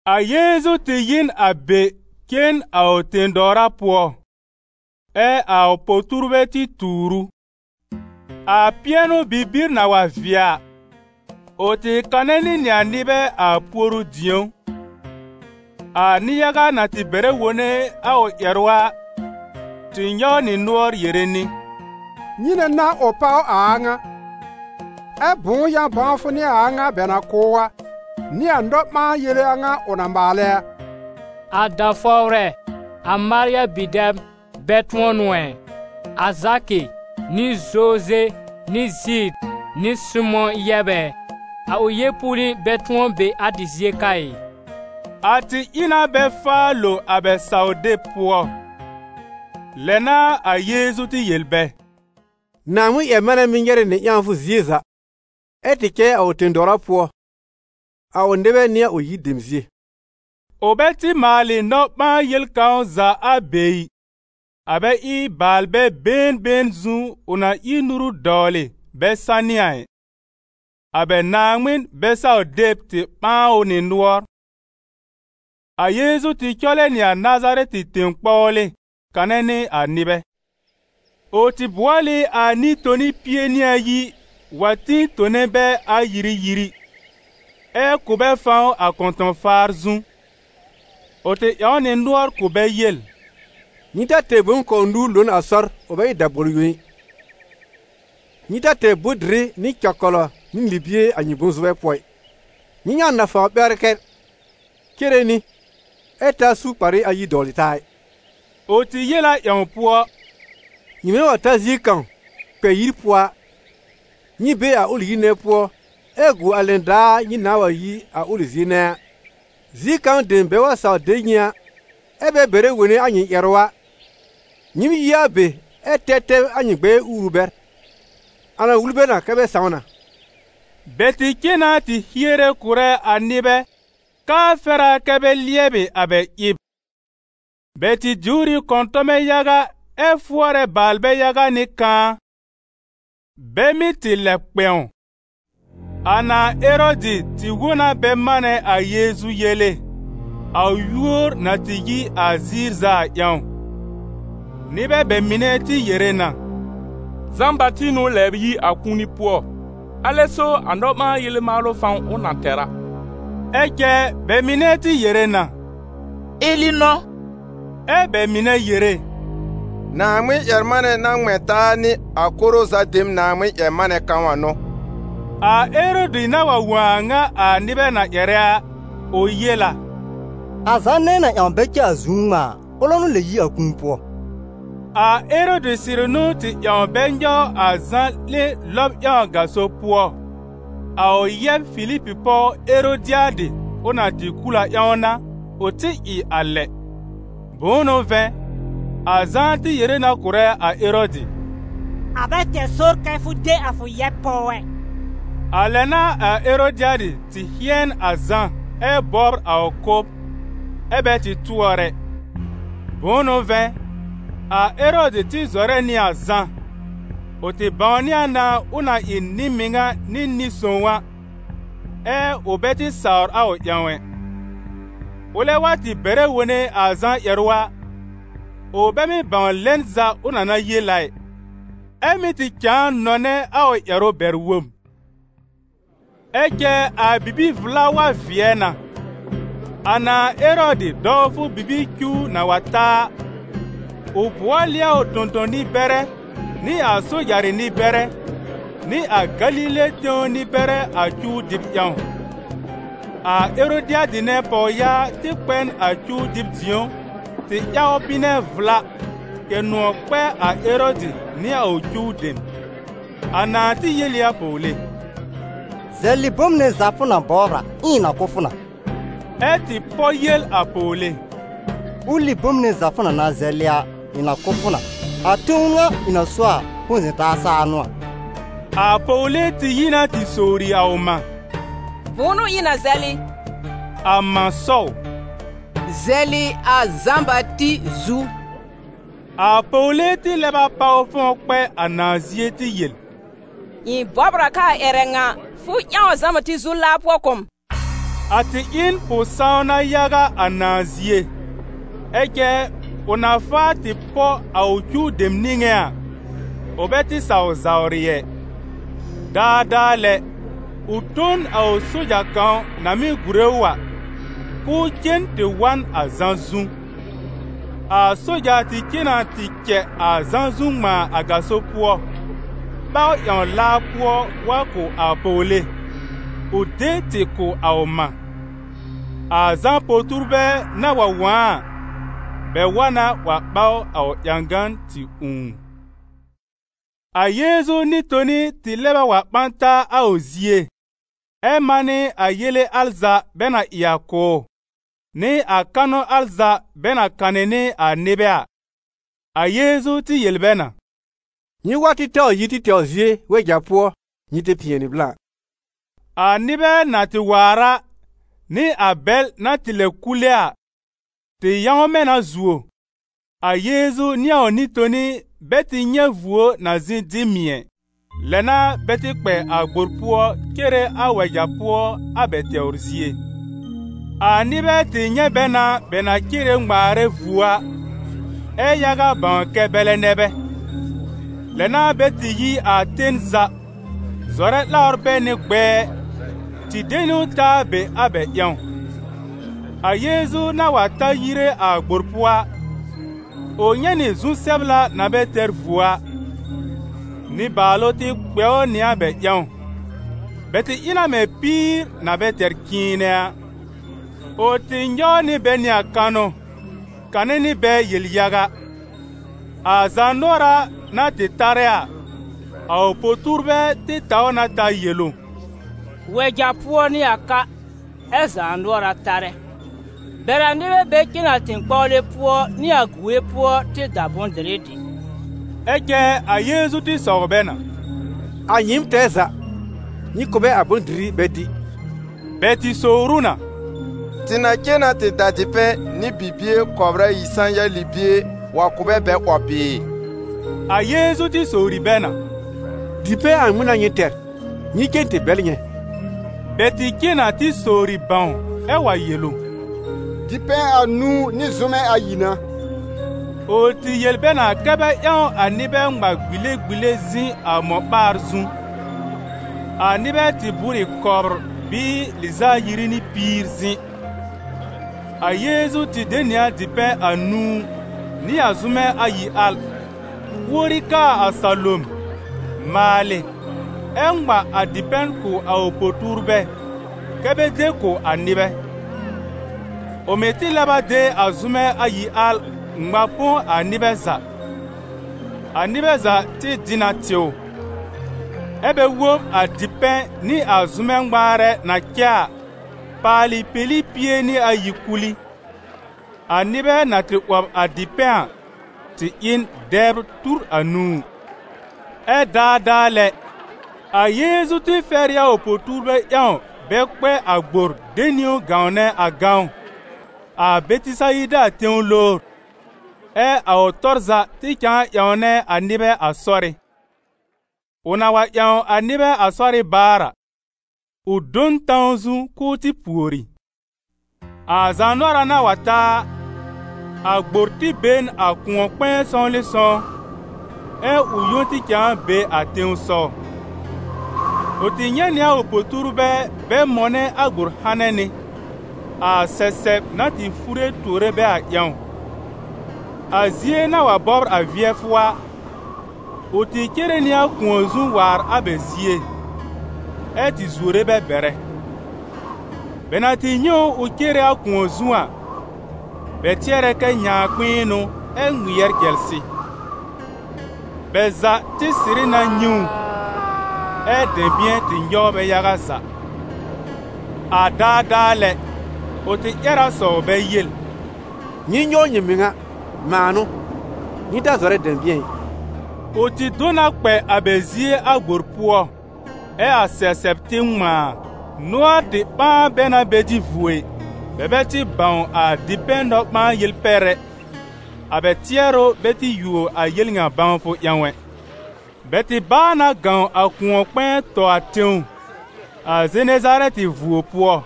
A Yeezu tɩ yi n a be cen a ʋ tẽ-dɔwra pʋɔ. Ɛ a po-tuurbɛ tɩ tuur ʋ. A pɩɛnʋ-bibir na wa vɩɛ a, ʋ tɩ kanɛ nɩ nɩ a nɩbɛ a puoru-dĩ̀ó. A nɩ-yaga na tɩ bɛrɛ wone a ʋ ƴɛrʋ a, tɩ nyɔw nɩ nʋɔr yere nɩ: «Nyɩnɛ n'a ʋ páw a a ŋa? Ɛ bʋ̃ʋ yã-bãwfʋ n'ɩ a a ŋa bɛ na kʋ̀ ʋ a, nɩ a nɔ-ɓãa-yele a ŋa ʋ na maalɛ a? A da-fɔwrɛ, a Marya bi-dɛb, bɛ tʋ̃ɔ n'ʋ ɛ? A Zakɩ nɩ Zoze nɩ Zid nɩ Sɩmʋ̃ yɛb ɛ? A ʋ yeepuuli bɛ tʋ̃ɔ be a tɩ zie ka ɩ?» A tɩ ɩ na bɛ faa lo a bɛ saw-deb pʋɔ. Lɛ n'a a Yeezu tɩ yel bɛ: « Naaŋmɩn-ƴɛr-manɛ mɩ́ nyɛrɛ nɩ ƴãwfʋ zie za, ɛ tɩ cɛ a ʋ tẽ-dɔwra pʋɔ, a ʋ nɩbɛ nɩ a ʋ yir dem zie.» Ʋ bɛ tɩ maalɩ nɔ-ɓãa-yel kãw za a be ɩ, a bɛ ɩ baalbɛ been been zu ʋ na ír nuru dɔwlɩ bɛ sanɩ a ɩ. A bɛ Naaŋmɩn bɛ-saw-deb tɩ ɓãa ʋ nɩ nʋɔr. A Yeezu tɩ cɔlɛ nɩ a Nazarɛtɩ tẽ-kpɔwlɩ kanɛ nɩ a nɩbɛ. Ʋ tɩ bʋɔl ɩ a Nɩ-toni pie nɩ ayi wa tĩ tone bɛ ayiri-yiri, ɛ kʋ̀ bɛ fãw a kɔ̃tɔ̃-faar zu. Ʋ tɩ ƴãw nɩ nʋɔr kʋ̀ bɛ yel: «Nyɩ ta tɛr bom kɔw nũu lo n a sɔr, ʋ bɛ ɩ dabɔl yõ ɩ. Nyɩ ta tɛr bʋ̃-dɩrɩ, nɩ cɛkɔlɔ, nɩ libie a nyɩ bʋ̃-zʋbɛ pʋɔ ɩ. Nyɩ ƴãw nafawr ɓɛwlɩkɛl cere nɩ, ɛ ta su kparɩ ayi dɔwlɩ taa ɩ.» Ʋ tɩ yel a ƴãw pʋɔ: «Nyɩmɛ wa ta zie kãw kpɛ yir pʋɔ a, nyɩ be a ʋlɩ yir nɛ pʋɔ ɛ gu a lɛn daar nyɩ nãa wa yi a ʋlɩ zie nɛ a. Zie kãw dem bɛ wa saw de nyɩ a, ɛ́ bɛ bɛrɛ wone a nyɩ ƴɛrʋ a, nyɩɩm yi a be ɛ tɛb tɛb a nyɩ gbɛɛ uuru bɛr, a na wul bɛ na kɛ bɛ sãw na.» Bɛ tɩ cen na tɩ hiere kʋ̀rɛ a nɩbɛ k'aa fɛr a kɛ bɛ lɩɛbɩ a bɛ ɩb. Bɛ tɩ diwr ɩ kɔ̃tɔmɛ yaga ɛ fʋɔrɛ baalbɛ yaga nɩ kãa, bɛ mɩ́ tɩ lɛb kpɛ̃w. A nãà Erɔdɩ tɩ wõ na bɛ manɛ a Yeezu yele, a ʋ yúor na tɩ yi a ziir za a ƴãw; nɩbɛ bɛ mɩnɛ tɩ yere na: «Zã-Bati n'ʋ lɛb yi a kũuni pʋɔ, alɛ so a nɔ-ɓãa-yele maalʋ fãw ʋ na tɛr a.» Ɛ cɛ bɛ mɩnɛ tɩ yere na: « Eli n'ʋ!» Ɛ bɛ mɩnɛ yere: «Naaŋmɩn-ƴɛr-manɛ na ŋmɛ̃ taa nɩ a koro za dem Naaŋmɩn-ƴɛr-manɛ kãw a n'ʋ!» A Erɔdɩ na wa wõ a a ŋa a nɩbɛ na ƴɛrɛ a, ʋ yel a: «A Zã nɛ ɩ̃ na ƴãw bɛ cɛ a zu ŋmãa a, ʋlɛ n'ʋ lɛb yi a kũu pʋɔ!» A Erɔdɩ sɩrɩ n'ʋ tɩ ƴãw bɛ nyɔw a Zã 'lẽ lɔb ƴãw a gaso pʋɔ, a ʋ yɛb Filib pɔw Erodɩadɩ ʋ na tɩ kul a ƴãw n'a, ʋ tɩ a lɛ. Bʋ̃ʋ n'ʋ vɛ̃, a Zã tɩ yere na kʋ̀rɛ a Erɔdɩ: «A bɛ tɛr sɔr kɛ fʋ de a fʋ yɛb pɔw ɛ!» A lɛ n'a a Erodɩadɩ tɩ hɩ̃ɛn a Zã ɛ bɔbr a ʋ kʋ́b, ɛ bɛ tɩ tʋɔr ɛ; bʋ̃ʋ n'ʋ vɛ̃, a Erɔdɩ tɩ zɔrɛ nɩ a Zã, ʋ tɩ bãwnɩ a na ʋ na ɩ nɩ-mɩŋa nɩ nɩ-sõw a, ɛ ʋ bɛ tɩ sawr ʋ ƴãw ɛ. Ʋlɛ wa tɩ bɛrɛ wone a Zã ƴɛrʋ a, ʋ bɛ mɩ́ bãw lɛn za ʋ na na yel a ɩ, ɛ mɩ́ tɩ cãa nɔnɛ a ʋ ƴɛrʋ bɛr-wob. Ɛ cɛ a bibi-vla wa vɩɛ na. A nãà Erɔdɩ dɔwfʋ bibir cuw na wa ta a, ʋ bʋɔl ɩ a ʋ tõ-tõ-nɩ-bɛrɛ nɩ a sojarɩ nɩ-bɛrɛ, nɩ a Galile tẽw nɩ-bɛrɛ a cuw dɩb ƴãw. A Erodɩadɩ nɛ pɔwyaa tɩ kpɛ n a cuw dɩb dĩ̀ó tɩ ƴaw bɩnɛ vla, kɛ̀ nʋ̃ɔ̀ kpɛ a Erɔdɩ nɩ a ʋ cuw dem. A nãà tɩ yel ɩ a pɔwle: «Zɛlɩ bom nɛ za fʋ na bɔbr a, ɛ ɩ̃ na kʋ̀ fʋ na!» Ɛ tɩ pɔ yel a pɔwle: «Ʋlɩ bom nɛ za fʋ na na zɛlɩ a, ɩ̃ na kʋ̀ fʋ na, a tẽw ŋa ɩ̃ na so a, põ-zɛ̃-taa saa n'ʋ a!» A pɔwle tɩ yi na tɩ sowri a ʋ mã: «Bʋ̃ʋ n'ʋ ɩ̃ na zɛlɩ?» A mã sɔw: «Zɛlɩ a Zã-Bati zu!» A pɔwle tɩ lɛb a páw fɔ̃w kpɛ a nãà zie tɩ yel: «Ɩ̃ bɔbr a k'aa ƴɛrɛ ŋa, fʋ ƴãw a Zã-Bati zu laa pʋɔ kʋ̀ m.» A tɩ ɩ n pʋ-sãwna yaga a nãà zie, ɛ cɛ ʋ na faa tɩ pɔ a ʋ cuw dem niŋé a, ʋ bɛ tɩ saw zawrɩ ɛ. Daadaa lɛ, ʋ tõ n a ʋ soja kãw na mɩ́ gùre ʋ a, k'ʋʋ cen tɩ wa n a Zã zu. A soja tɩ cen na tɩ cɛ a Zã zu ŋmãa a gaso pʋɔ, ɓaw ƴãw laa pʋɔ wa kʋ̀ a pɔwle, ʋ de tɩ kʋ̀ a ʋ mã. A Zã po-tuurbɛ na wa wõ a a, bɛ wa na wa ɓaw a ʋ ƴãgan tɩ ũù. A Yeezu Nɩ-toni tɩ lɛb a wa ɓã taa a ʋ zie, ɛ manɩ a yele al za bɛ na ɩ a kʋ̀ ʋ, nɩ a kanʋ al za bɛ na kanɩ nɩ a nɩbɛ a. A Yeezu tɩ yel bɛ na: «Nyɩ wa tɩ taw yi tɩ tɛwr zie wɛja pʋɔ nyɩ tɩ pɩɛnɩ blã.» A nɩbɛ na tɩ waar a, nɩ a bɛl na tɩ lɛb kule a, tɩ yãwmɛ na zuo, a Yeezu nɩ a ʋ Nɩ-toni bɛ tɩ nyɛ̃ vuo na zɩ̃ dɩ mɩ̀ ɛ. Lɛ n'a bɛ tɩ kpɛ a gbor pʋɔ cere a wɛja pʋɔ a bɛ tɛwr zie. A nɩbɛ tɩ nyɛ̃ bɛ na bɛ na cere ŋmaarɛ vuo a, ɛ yaga bãw kɛ bɛlɛ nɛ bɛ. Lɛ n'a bɛ tɩ yi a ten za, zɔrɛ 'lawr bɛ nɩ gbɛɛ, tɩ de niwn ta a be a bɛ ƴãw. A Yeezu na wa ta yire a gbor pʋɔ a, ʋ nyɛ̃ nɩ zu-sɛbla na bɛ tɛr vuo a. Nɩbaalʋ tɩ kpɛ ʋ nɩ a bɛ ƴãw, bɛ tɩ ɩ na mɛ̃ píir na bɛ tɛr cɩ̃ɩnɛ a. Ʋ tɩ nyɔw nɩ bɛ nɩ a kanʋ, kanɩ nɩ bɛ yel-yaga. A zaanʋɔra na tɩ tarɛ a, a ʋ po-tuurbɛ tɩ taw na ta yel ʋ: «Wɛja pʋɔ n'ɩ a ka, ɛ zaanʋɔra tarɛ. Bɛr a nɩbɛ bɛ cen a tẽ-kpɔwlɩ pʋɔ nɩ a gue pʋɔ tɩ da bʋ̃-dɩrɩ dɩ.» Ɛ cɛ a Yeezu tɩ sɔw bɛ na: «A nyɩɩm tɛɛ za, nyɩ kʋ̀ bɛ a bʋ̃-dɩrɩ bɛ dɩ.» Bɛ tɩ sowr ʋ na: «Tɩ na cen na tɩ da dipɛ̃ nɩ bibie kɔbr ayi sã-ya libie wa kʋ̀ bɛ bɛ 'wɔb bɩɩ?» A Yeezu tɩ sowri bɛ na: «Dipɛ̃ a ŋmɩn n'a nyɩ tɛr? Nyɩ cen tɩ bɛl nyɛ̃.» Bɛ tɩ cen na tɩ sowri bãw, ɛ́ wa yel ʋ: «Dipɛ̃ anũu nɩ zʋ́mɛ ayi n'a.» Ʋ tɩ yel bɛ na kɛ́ bɛ ƴãw a nɩbɛ ŋma gbile-gbile zɩ̃ a mɔ-ɓaar zu. A nɩbɛ tɩ bʋ́r ɩ kɔbr bɩɩ lɩz'a ayiri nɩ piir zɩ̃. A Yeezu tɩ de nɩ a dipɛ̃ anũu nɩ a zʋ́mɛ ayi al, uori kaa a salom, maalɩ, ɛ ŋma a dipɛ̃ kʋ̀ a ʋ po-tuurbɛ kɛ́ bɛ de kʋ̀ a nɩbɛ. Ʋ mɩ̀ tɩ lɛb a de a zʋ́mɛ ayi al ŋma põ a nɩbɛ za. A nɩbɛ za tɩ dɩ na tɩw. Ɛ́ bɛ wob a dipɛ̃ nɩ a zʋ́mɛ ŋmaarɛ na cɛ a, paalɩ peli pie nɩ ayi kul ɩ. A nɩbɛ na tɩ 'wɔb a dipɛ̃ a, tɩ ɩ n dɛbr tur anũu. Ɛ daadaa lɛ, a Yeezu tɩ fɛr ɩ a ʋ po-tuurbɛ ƴãw bɛ kpɛ a gbor de niwn gãwnɛ a gãwn, a Bɛtɩsayida tẽw lowr, ɛ a ʋ tɔr za tɩ cãa ƴãwnɛ a nɩbɛ a sɔrɩ́. Ʋ na wa ƴãw a nɩbɛ a sɔrɩ́ baar a, ʋ do n tãw zu k'ʋʋ tɩ pùori. A zaanʋɔra na wa ta a, a gbor tɩ be n a kʋ̃ɔ-kpɛ̃ɛ sɔwlɩsɔw, ɛ ʋ yõ tɩ cãa be a tẽsɔw. Ʋ tɩ nyɛ̃ nɩ a ʋ po-tuurbɛ bɛ mɔnɛ a gbor hanɛ nɩ, a sɛsɛb na tɩ fure tuore bɛ a ƴãw. A zie na wa bɔbr vɩɛfʋ a, ʋ tɩ cere nɩ a kʋ̃ɔ zu waar a bɛ zie, ɛ tɩ zuore bɛ bɛrɛ. Bɛ na tɩ nyɛ̃ ʋ ʋ cere a kʋ̃ɔ zu a, bɛ tɩɛrɛ kɛ nyãakpɩ̃ɩn n'ʋ ɛ ŋmɩɛr cɛlsɩ. Bɛ za tɩ sɩrɩ na nyɛ̃ ʋ, ɛ dɛ̃bɩ̃ɛ tɩ nyɔw bɛ yaga za. A daadaa lɛ, ʋ tɩ ƴɛr a sɔw bɛ yel: «Nyɩ nyɔw nyɩ mɩŋa! Mãa n'ʋ, nyɩ ta zɔrɛ dɛ̃bɩ̃ɛ ɩ!» Ʋ tɩ do na kpɛ a bɛ zie a gbor pʋɔ, ɛ a sɛsɛb tɩ ŋmãa. Nʋɔr tɩ ɓãa bɛ na bɛ dɩ vuo ɩ. Bɛ bɛ tɩ bãw a dipɛ̃ nɔ-ɓãa-yel pɛr ɛ, a bɛ tɩɛrʋ bɛ tɩ yuo a yel ŋa bãwfʋ ƴãw ɛ. Bɛ tɩ báa na gãw a kʋ̃ɔ-kpɛ̃ɛ tɔ a tẽw, a Zenezarɛtɩ vuo pʋɔ.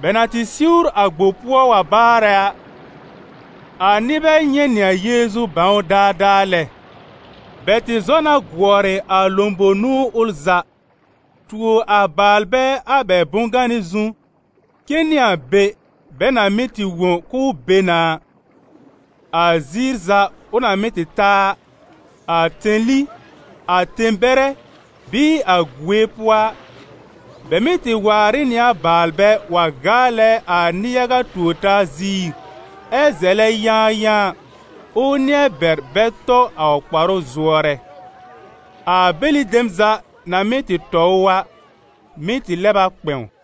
Bɛ na tɩ siwr a gbor pʋɔ wa baarɛ a, a nɩbɛ nyɛ̃ nɩ a Yeezu bãw ʋ daadaa lɛ. Bɛ tɩ zɔ na gʋɔrɩ a lõbowr-nũu ʋl za, tuo a baalbɛ a bɛ bʋ̃-ganɩ zu cen nɩ a be bɛ na mɩ́ tɩ wõ k'ʋʋ be na a. A ziir za ʋ na mɩ́ tɩ ta a, a tẽli, a tẽ-bɛrɛ bɩɩ a gue pʋɔ a, bɛ mɩ́ tɩ waar ɩ nɩ a baalbɛ wa gaalɛ a nɩ-yaga tuor-taa ziir ɛ zɛlɛ yãayãa, ʋʋ nɩ̃ɛ bɛr bɛ tɔ a ʋ kparʋ zʋɔrɛ. A bɛlɩ dem za na mɩ́ tɩ tɔ ʋ a, mɩ́ tɩ lɛb a kpɛ̃w.